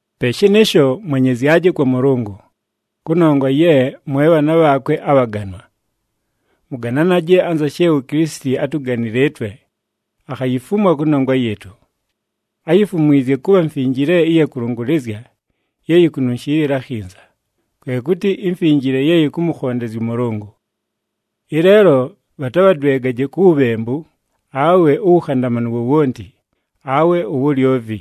Pe shɨnɨɨsho, mwenyezyaje kwa Mʉlʉngʉ, kʉnongwa ye mwe bhaana bhaakwe abhaganwa. Mʉgananaje anza she uKilisiti átuganile ɨtwe, akhayifumwa kʉnongwa yɨɨtʉ. Áyifumwizye kʉbha mfinjile ɨya kʉlʉngʉlɨzya ye yikununshiilila akhinza, kwe kʉtɨ imfinjile ye yɨkʉmʉkhondezya ʉMʉlʉngʉ. Ɨleelo bhatabhadwegaje ku wubhembu, awe uwukhandamanu wowonti, awe uwulyovi.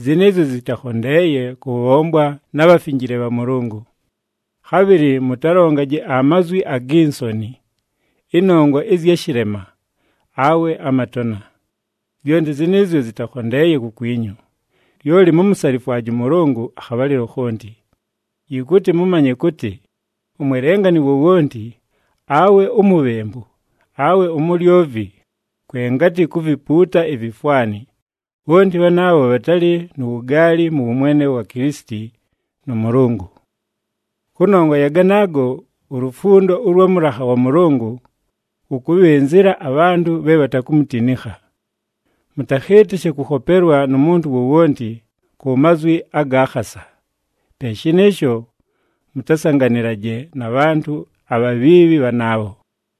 Zɨnɨɨzyo zɨtakhondeeye kʉbhombwa na bhafinjile bha Mʉlʉngʉ. Khabhɨlɨ mʉtalongaje amazwi agi nsoni, ɨnongwa ɨzya shɨlema, awe amatona. Zyonti zɨnɨɨzyo zɨtakhondeeye kukwinyu. Lyoli mumusalifwaje ʉMʉlʉngʉ akhabhalɨlo khonti. Yɨkʉtɨ mʉmanye kʉtɨ, umwelengani wowonti, awe umubhembu, awe umulyovi, kwe ngatɨ kuvipuuta ivifwani, bhonti bhanaabho bhatalɨ nu wugaali mʉ wʉmwene wa Kilisiti nʉ Mʉlʉngʉ. Kʉnongwa ya ganaago, ulufundo ʉlwa mʉlakha wa Mʉlʉngʉ lʉkʉbhɨnzɨla abhantʉ bhe bhatakumutinikha. Mʉtakhɨɨtɨshe kʉkhopelwa nu muntu wowonti ku mazwi aga khasa. Pe shɨnɨɨsho, mʉtasanganɨlaje na bhantʉ abhabhiibhi bhanaabho.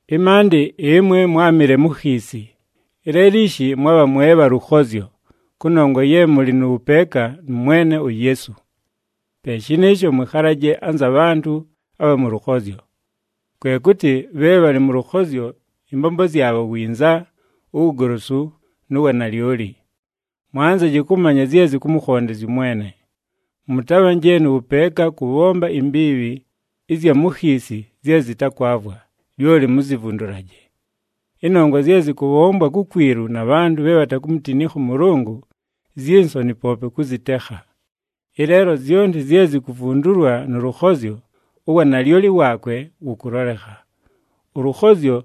Ɨmaandɨ ɨmwe mwámɨle mu khiisi, ɨleelo ishi mwabha mwe bha lʉkhozyo kʉnongwa ye mʉlɨ nʉ wʉpeeka nʉ Mwene uYeesu. Pe shɨnɨɨsho mwɨkhalaje anza bhantʉ abha mʉ lʉkhozyo. Kwe kʉtɨ bhe bhalɨ mʉ lʉkhozyo ɨmbombo zyabho winza, uwugolosu, nu wanalyoli. Mwanzaje kʉmanya zye zɨkʉmʉkhondezya ʉMwene. Mʉtabhanje nʉ wʉpeeka kʉbhomba imbiibhi ɨzya mu khiisi zye zɨtakwavwa, lyoli muzivundulaje. Ɨnongwa zye zɨkʉbhombwa kukwilu na bhantʉ bhe bhatakumutinikha ʉMʉlʉngʉ zyi nsoni poope kʉzɨtekha. Ɨleelo zyonti zye zikuvundulwa nʉ lʉkhozyo, uwanalyoli waakwe wʉkʉlolekha. Ʉlʉkhozyo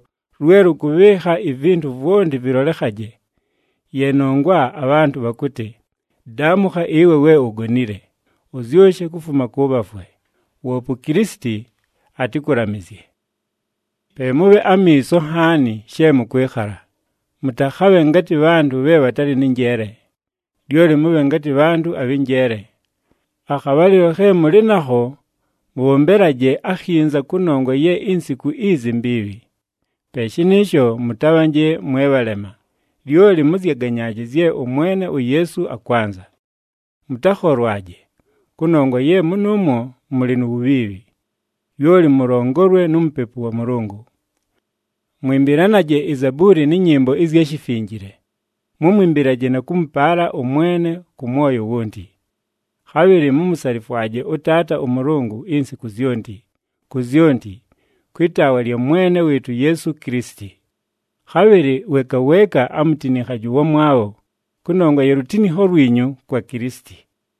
lwe lʉkʉbhɨɨkha ivintu vwonti vɨlolekhaje. Ye nongwa abhantʉ bhakʉtɨ, “Daamʉkha ɨwe we ugonile! Ʉzyʉshe kufuma kʉ bhafwe. Woope uKilisiti atɨkʉlamɨzye.” Pe mʉbhe amiiso nhaani she mʉkwɨkhala, mʉtakhabhe ngatɨ bhantʉ bhe bhatalɨ nɨ njeele, lyoli mʉbhe ngatɨ bhantʉ abhɨ njeele. Akhabhalɨlo khe mʉlɨ nakho mʉbhombelaje akhinza kʉnongwa ye insiku izi mbiibhi. Pe shɨnɨɨsho mʉtabhanje mwe bhalema, lyoli mʉzyaganyaaje zye ʉMwene uYeesu akwanza. Mʉtakholwaje, kʉnongwa ye mʉnʉʉmwo mʉlɨ nu wubhiibhi. Lyoli mʉlongolwe nu Mupepu wa Mʉlʉngʉ. Mwɨmbɨlanaje izabuuli nɨ nyɨmbo ɨzya shifinjile, mʉmwɨmbɨlaje na kʉmʉpaala ʉMwene kʉ mwoyo wonti. Khabhɨlɨ mumusalifwaje ʉTaata ʉMʉlʉngʉ insiku zyonti, ku zyonti, kwɨ taawa lya Mwene wɨɨtʉ uYeesu Kilisiti. Khabhɨlɨ weeka weeka amutinikhaje ʉwamwabho, kʉnongwa ya lutinikho lwinyu kwa Kilisiti.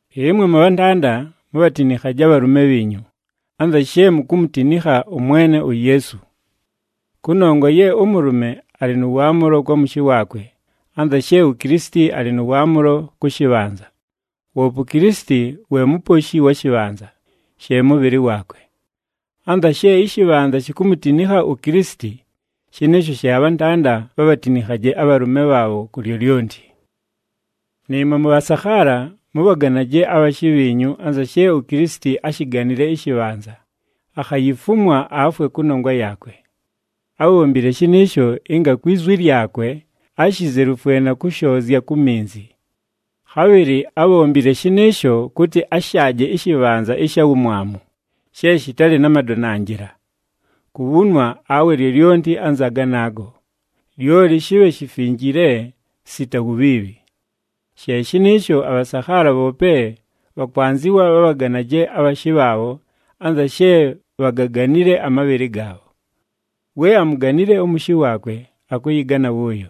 Ɨmwe mʉbhantanda, mubhatinikhaje abhalʉme bhiinyu, anza she mukumutinikha ʉMwene uYeesu. Kʉnongwa ye ʉmʉlʉme alɨ nʉ waamʉlo kwa mʉshɨ waakwe anza she uKilisiti alɨ nʉ waamʉlo kʉ shɨbhanza, woope uKilisiti we Muposhi wa shɨbhanza, she mʉbhɨlɨ waakwe. Anza she ɨshɨbhanza shikumutinikha uKilisiti, shɨnɨɨsho she abhantanda bhabhatinikhaje abhalʉme bhaabho ku lyolyonti. Nɨɨmwe mʉbhasakhaala, mʉbhaganaje abhashɨ bhiinyu anza she uKilisiti áshiganile ɨshɨbhanza, akhayifumwa afwe kʉnongwa yaakwe. Ábhombile shɨnɨɨsho ɨnga kwi zwi lyakwe, ashizelufwe na kʉshoozya ku minzi. Khabhɨlɨ ábhombile shɨnɨɨsho kʉtɨ ashaaje ɨshɨbhanza ɨsha wumwamu, she shɨtalɨ na madonanjɨla, kubhunwa awe lyolyonti anza ganaago, lyoli shɨbhe shifinjile sita wubhiibhi. She shɨnɨɨsho, abhasakhaala bhoope bhakwanzɨwa bhabhaganaje abhashɨ bhaabho anza she bhagaganile amabhɨlɨ gaabho. We amuganile ʉmʉshɨ waakwe, akʉyɨgana wʉʉyo.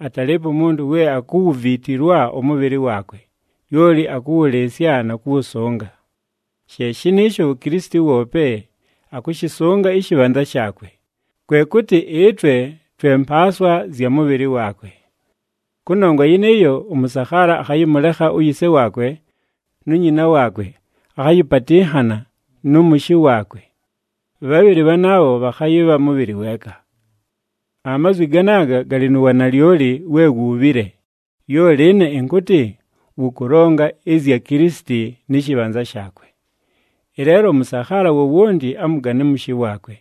Atalɨɨpo umuntu we akuwuviitilwa ʉmʉbhɨlɨ waakwe, lyoli akʉwʉlɨɨsya na kʉwʉsʉnga. She shɨnɨɨsho uKilisiti woope akʉshɨsʉnga ɨshɨbhanza shaakwe, kwe kʉtɨ ɨtwe twe mpaaswa zya mʉ mʉbhɨlɨ waakwe. Kʉnongwa yɨnɨɨyo, “Ʉmʉsakhaala akhayɨmʉlekha uyise waakwe nu nyina waakwe, akhayɨpatɨnhana nʉ mʉshɨ waakwe. Bhabhɨlɨ bhanaabho bhakhayɨbha mʉbhɨlɨ weeka.” Amazwi ganaaga galɨ nu wanalyoli we wuubhile, lyoli ɨne ɨnkʉtɨ wʉkʉlonga ɨzya Kilisiti nɨ shɨbhanza shaakwe. Ɨleelo ʉmʉsakhaala wowonti amʉgane ʉmʉshɨ waakwe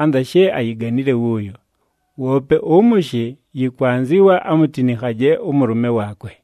anza she ayiganile wʉʉyo, woope ʉmʉshɨ yɨkwanzɨwa amutinikhaje ʉmʉlʉme waakwe.